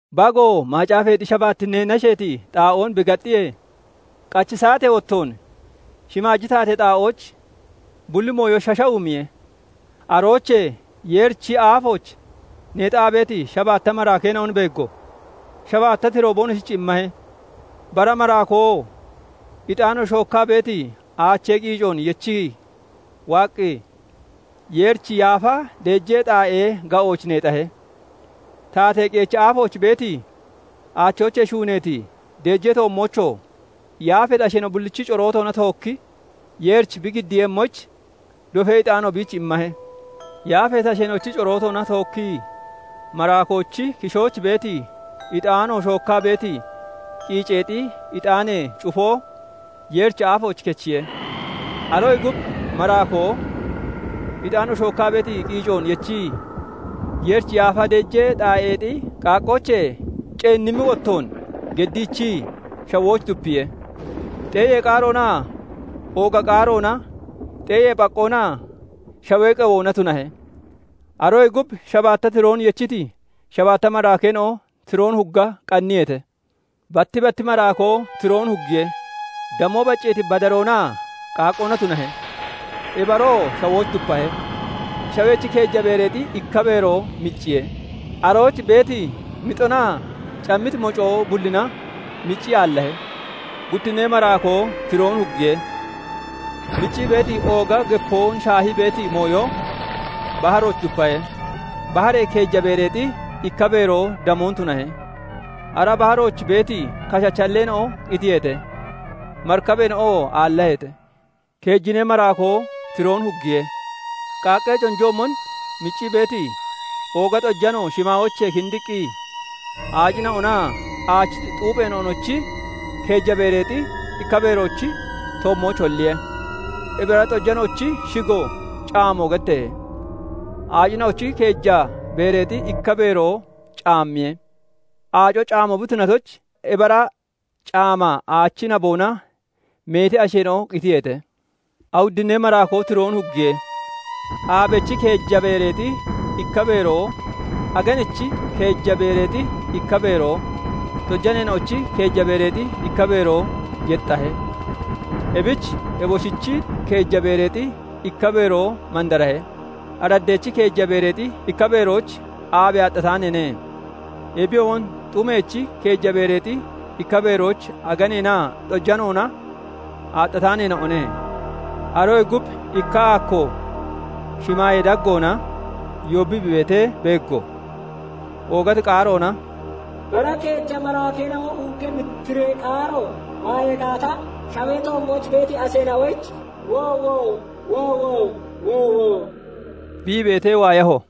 Bagoo macaafeexi shabaattinnee nasheeti xaa'oon bi gaxxiyee, qachi saatee wottoon shimaaji taatee xaa'ooch bulli mooyo shashawumiye. Aroochee Yeerichi aafooch neexaa beeti shabaatta maraakeena'on beeggo; shabaatta tiroo boonoshich immahe. Bara maraakoo ixaano shookkaa beeti aachee qiicoon yechii waaqqi, Yeerichi yaafa deejee xaa'ee ga'ooch neexahe; taatee qeechi aafooch beeti, aachoochee shuuneeti deejee toommoochoo yaafeeti asheena'o bullichi corootoona tookki Yeerich bi giddiiyemmoyich, dofee ixaano biich immahe. Yaafeeti asheena'ochi corootoona tookkii maraakoochi kishooch beeti ixaano shookkaa beeti qiiceexi ixaanee cufoo Yeerichi aafooch kechiye. Aroyee gub maraakoo ixaano shookkaa beeti qiicoon yechii, Yeerichi yaafa deejee xaa'eexi qaaqqoochee ceennimmi wottoon geddiichii shawooch dupiye; xeeyee qaaroonaa ooga qaaroona, xeeyee phaqqoonaa shawee qewoona tunahe. Aroyee gub shabaatta tiroon yechiti shabaatta maraakeena'o tiroon hugga qanniyeete. Batti batti maraakoo tiroon huggiye. Damoo bacceeti badaroonaa qaaqqoona tunahe; ebi aroo shawooch dupahe; shawechi keeja beereexi ikka beeroo micciye; arooch beeti mixonaa cammiti mocoo bullina miccii aallahe. Guttinnee maraakoo tiroon huggiye; miccii beeti ooga gepoon shaahii beeti mooyo baharooch dupahe; baharee keeja beereexi ikka beeroo damoon tunahe; ara baharooch beeti kashachi halleena'o qitiyeete; marikabeena'oo aallaheete. Keejinnee maraakoo tiroon huggiye; qaaqqee conjoochoomon miccii beeti ooga xojano shimaayoochee kindiqqi aacina'onaa aachi xuupheena'onochi keeja beereexi ikka beeroochi toommooch holliye. Ebi ara xojanoochi shigoo caamo getteehe; aacina'ochi keeja beereexi ikka beeroo caammiye; aaco caamo bi tunatoyich, ebi ara caama aachi naboona meeti asheena'o qitiyeete. Awuddinnee maraakoo tiroon huggiye; aabechi keeja beereexi ikka beeroo, aganechi keeja beereexi ikka beeroo, xojaneena'ochi keeja beereexi ikka beeroo yexxahe; ebich eboshichi keeja beereexi ikka beeroo mandarahe; araddeechi keeja beereexi ikka beerooch aabe aaxxataaneene; ebiyoomon xumeechi keeja beereexi ikka beerooch aganeenaa xoojanoona aaxxataaneena'one. Aroyee gub ikka aakko (booyo) shimaayee daggoona yoobbii bi beetee beeggo; oogati qaaroona "Bara keeja maraakeena'o huggemmi tiree qaaro waayee gaata, shawee toommooch beeti asheena'oyich woowo! Woowo! Woowo! bi ii beetee waayaho.